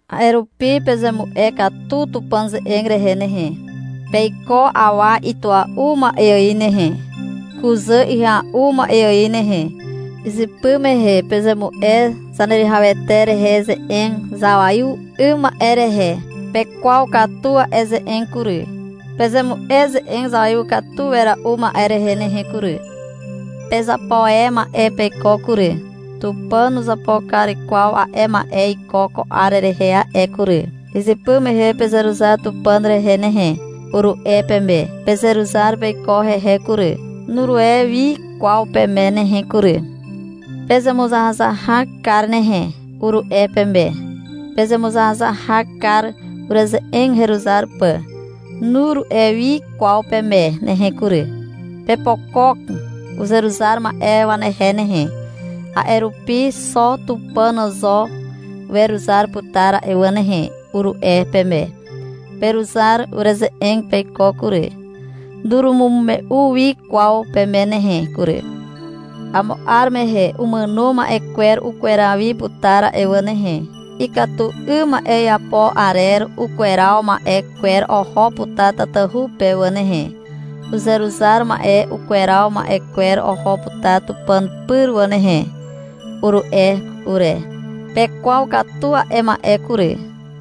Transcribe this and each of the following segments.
A'e rupi pezemu'e katu Tupàn ze'eg rehe nehe. Peiko awa itua'u ma'e ài nehe, kuzà ihya'u ma'e ài nehe. Izypy mehe pezemu'e Zaneruwihawete rehe ze'eg zawaiw 'ym ma'e rehe. Pekwaw katu a'e ze'eg kury. Pezemu'e ze'eg zawaiw katu wera'u ma'e rehe nehe kury. Pezapo e ma'e peiko kury. Tupàn nuzapo kar kwaw a'e ma'e iko ko 'ar rehe a'e kury. Izypy mehe — Pezeruzar Tupàn rehe nehe, uru'e peme. Pezeruzar peiko hehe kury. Nuru'e wi kwaw peme nehe kury. — Pezemuzahazahak kar nehe, uru'e peme. Pezemuzahazahak kar, ureze'eg heruzar pà. Nuru'e wi kwaw peme nehe kury. — Pepokok uzeruzar ma'e wanehe nehe, a'e rupi xo Tupàn zo weruzar putar a'e wà nehe, uru'e peme. Peruzar ureze'eg peiko kury. Nurumume'u wi kwaw peme nehe kury. — Amo 'ar mehe umàno ma'e kwer ukweraw wi putar a'e wà nehe. Ikatu 'ym ma'e iapo arer ukweraw ma'e kwer oho putar tatahu pe wà nehe. Uzeruzar ma'e ukweraw ma'e kwer oho putar Tupàn pyr wà nehe, uru'e ure. Pekwaw katu a'e ma'e kury.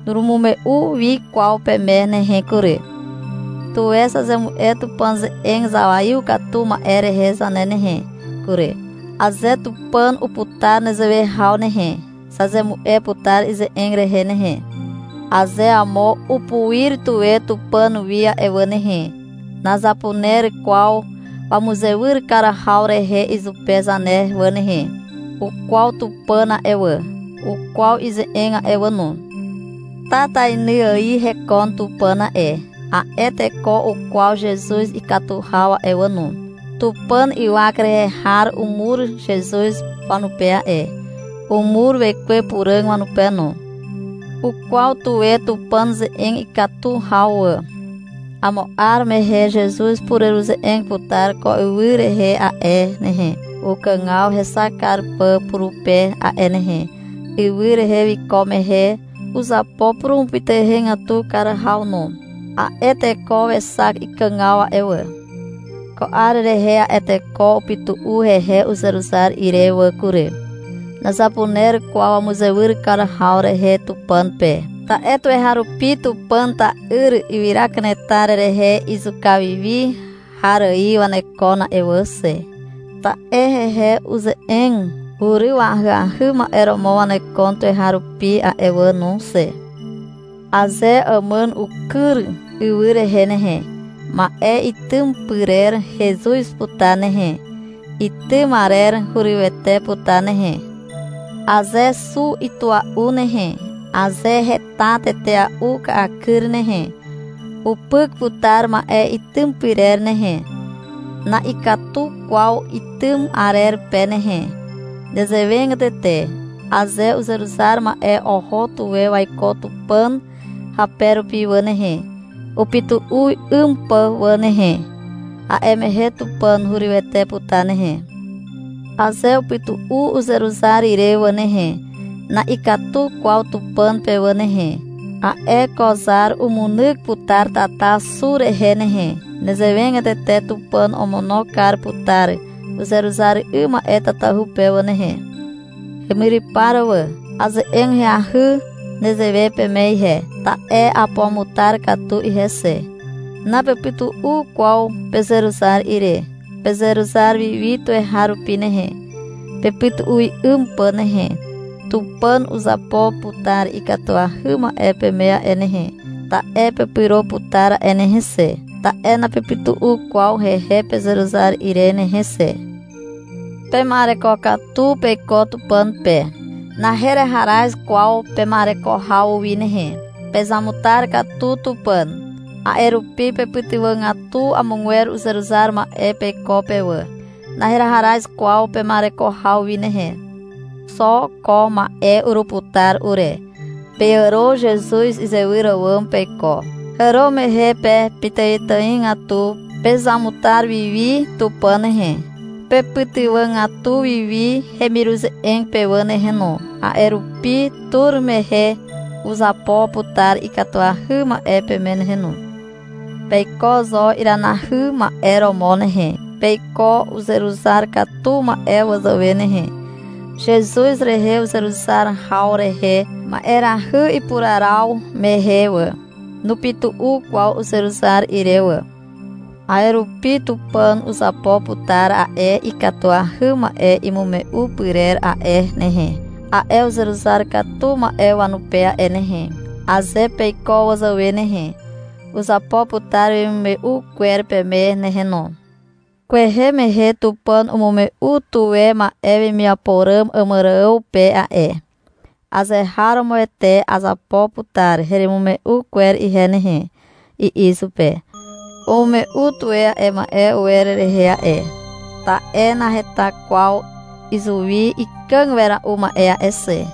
Nurumume'u wi kwaw peme nehe kury. Tuwe zazemu'e Tupàn ze'eg zawaiw katu ma'e rehe zane nehe kury. Aze Tupàn uputar nezewe haw nehe, zazemu'e putar ize'eg rehe nehe. Aze amo upuir tuwe Tupàn wi a'e wà nehe, nazapuner kwaw wamuzewyr kar haw rehe izupe zane wà nehe. Ukwaw Tupàn a'e wà, ukwaw ize'eg a'e wà no. Tatainy ài hekon Tupàn a'e. A'e teko ukwaw Zezuz ikatu haw a'e wà no. Tupàn ywak rehe har umur Zezuz wanupe a'e. Umur Wekwe Puràg wanupe no. Ukwaw tuwe Tupàn ze'eg ikatu haw wà. Amo 'ar mehe Zezuz upureruze'eg putar ko ywy rehe a'e nehe, ukàgaw hexak kar pà purupe a'e nehe. Ywy rehe wiko mehe uzapo purumupytuhegatu kar haw no. A'e teko wexak ikàgaw a'e wà. Ko 'ar rehe a'e teko upytu'u hehe uzeruzar ire wà kury. Nazapuner kwaw wamuzewyr kar haw rehe Tupàn pe, ta'e tuweharupi Tupàn ta'yr ywyra kanetar rehe izuka wi wi har ài wanekon a'e wà xe. Ta'e hehe uze'eg uryw ahyahy ma'e romo wanekon tuweharupi a'e wà no xe. Aze àmàn ukyr ywy rehe nehe, ma'e itym pyrer hezuz putar nehe. Itym arer hurywete putar nehe. Aze xu itua'u nehe, aze heta tetea'u ka'akyr nehe, upyk putar ma'e itym pyrer nehe. Na'ikatu kwaw itym arer pe nehe. Nezewegatete, aze uzeruzar ma'e oho tuwe waiko Tupàn hape rupi wà nehe, upytu'u 'ym pà wà nehe, a'e mehe Tupàn hurywete putar nehe. Aze upytu'u uzeruzar ire wà nehe, na'ikatu kwaw Tupàn pe wà nehe. A'e ko zar umunyk putar tata xu rehe nehe. Nezewegatete Tupàn omono kar putar uzeruzar 'ym ma'e tatahu pe wà nehe. Hemyrypar wà. Aze'eg ahyahy nezewe peme ihe, ta'e apuamutar katu ihe xe. Napepytu'u kwaw pezeruzar ire. Pezeruzar wi wi tuweharupi nehe, pepytu'u 'ym pà nehe. Tupàn uzapo putar ikatuahy ma'e peme a'e nehe, ta'e pepyro putar a'e nehe xe, ta'e napepytu'u kwaw hehe pezeruzar ire nehe xe. Pema'ereko katu peiko Tupàn pe. Naheharaz kwaw pema'ereko haw wi nehe. Pezamutar katu Tupàn. A'e rupi pepytywàgatu amogwer uzeruzar ma'e peiko pe wà. Naheharaz kwaw pema'ereko haw wi nehe. Xo ko ma'e uruputar ure. Peàro Zezuz izewyr àwàm peiko. Hàro mehe pe pitàitàigatu pezamutar wi wi Tupàn nehe. Pepytywàgatu wi wi hemiruze'eg pe wà nehe no. A'e rupi tur mehe uzapo putar ikatuahy ma'e peme nehe no. Peiko zo iranahy ma'e romo nehe. Peiko uzeruzar katu ma'e wazàwe nehe. Zezuz rehe uzeruzar haw rehe ma'erahy ipuraraw mehe wà, nupytu'u kwaw uzeruzar ire wà. A'e rupi Tupàn uzapo putar a'e ikatuahy ma'e imume'u pyrer a'e nehe, a'e uzeruzar katu ma'e wanupe a'e nehe. Aze peiko wazàwe nehe, uzapo putar wemimume'u kwer peme nehe no. Kwehe mehe Tupàn umume'u tuwe ma'e wemiapo ràm Àmàrààw pe a'e. — Azeharomoete azapo putar heremimume'u kwer ihe nehe, i'i izupe. Umume'u tuwe a'e ma'e uwer rehe a'e, ta'e naheta kwaw izuwi ikàg wera'u ma'e a'e xe.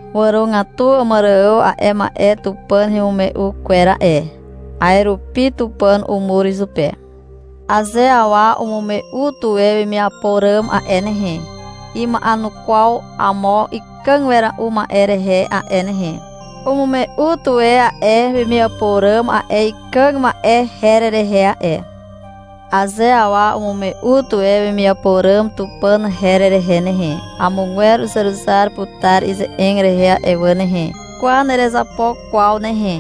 Wàrogatu Àmàrààw a'e ma'e Tupàn hemimume'u kwer a'e. A'e rupi Tupàn umur izupe. Aze awa umume'u tuwe wemiapo ràm a'e nehe, ima'enukwaw amo ikàg wera'u ma'e rehe a'e nehe. Umume'u tuwe a'e wemiapo ràm a'e ikàg ma'e her rehe a'e. Aze awa umume'u tuwe wemiapo ràm Tupàn her rehe nehe, amogwer uzeruzar putar ize'eg rehe a'e wà nehe. — Kwa, nerezapo kwaw nehe,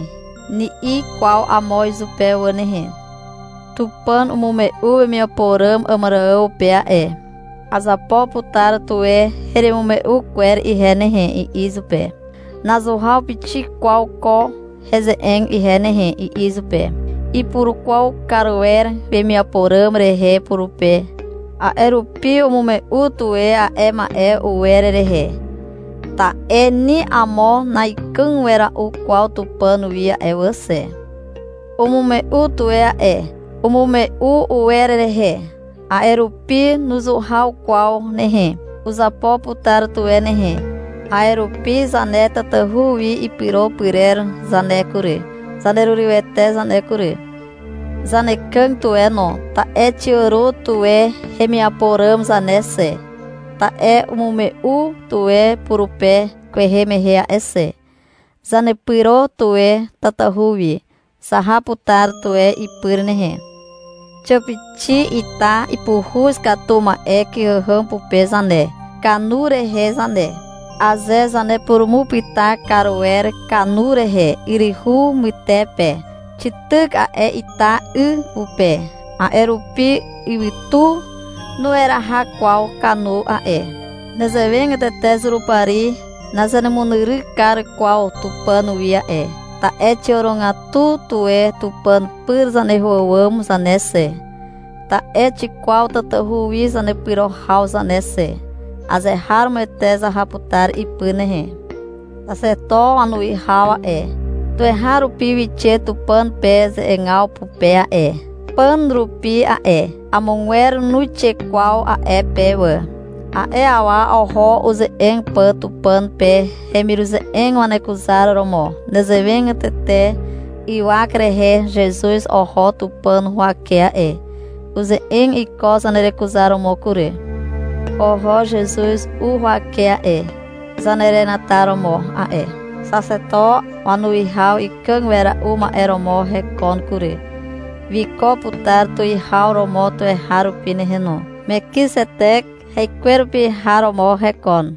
ni'i kwaw amo izupe wà nehe. Tupàn umume'u wemiapo ràm Àmàrààw pe a'e. — Azapo putar tuwe heremimume'u kwer ihe nehe, i'i izupe. Nazuhaw pixik kwaw ko heze'eg ihe nehe, i'i izupe. Ipurukwaw kar wer wemiapo ràm rehe purupe, a'e rupi umume'u tuwe a'e ma'e uwer rehe. (Ta'e ni amo na'ikàg wera'u kwaw Tupàn wi a'e wà xe.) Umume'u tuwe a'e. Umume'u uwer rehe. A'e rupi nuzuhaw kwaw nehe. Uzapo putar tuwe nehe. A'e rupi zane tatahu wi ipyro pyrer zane kury, zanerurywete zane kury. Zanekàg tuwe no, ta'e xiàro tuwe hemiapo ràm zane xe, ta'e umume'u tuwe purupe kwehe mehe a'e xe. Zanepyro tuwe tatahu wi. Zaha putar tuwe ipyr nehe. Xiàpixi ita ipuhuz katu ma'e kyhàhàm pupe zane, kanu rehe zane. Aze zanepurumupyta kar wer kanu rehe yryhu mytepe, xityk a'e ita 'y pupe. A'e rupi ywytu nueraha kwaw kanu a'e. Nezewegatete Zurupari nazanemunyryk kar kwaw Tupàn wi a'e, ta'e xiàrogatu tuwe Tupàn pyr zaneho àwàm zane xe, ta'e xikwaw tatahu wi zanepyro haw zane xe. Azeharomoete zaha putar ipyr nehe. Xaxeto wanuwihaw a'e, tuweharupi wixe Tupàn pe ze'egaw pupe a'e, pàn rupi a'e. Amogwer nuixe kwaw a'e pe wà. A'e awa oho uze'eg pà Tupàn pe, hemiruze'eg wanekuzaromo. Nezewegatete ywak rehe Zezuz oho Tupàn huwake a'e. Uze'eg iko zanerekuzaromo kury. Oho Zezuz u huwake a'e, zanerenataromo a'e. Xaxeto wanuwihaw ikàg wera'u ma'e romo hekon kury, wiko putar tuwihaw romo tuweharupi nehe no. Mekizetek haikwerupi har romo hekon.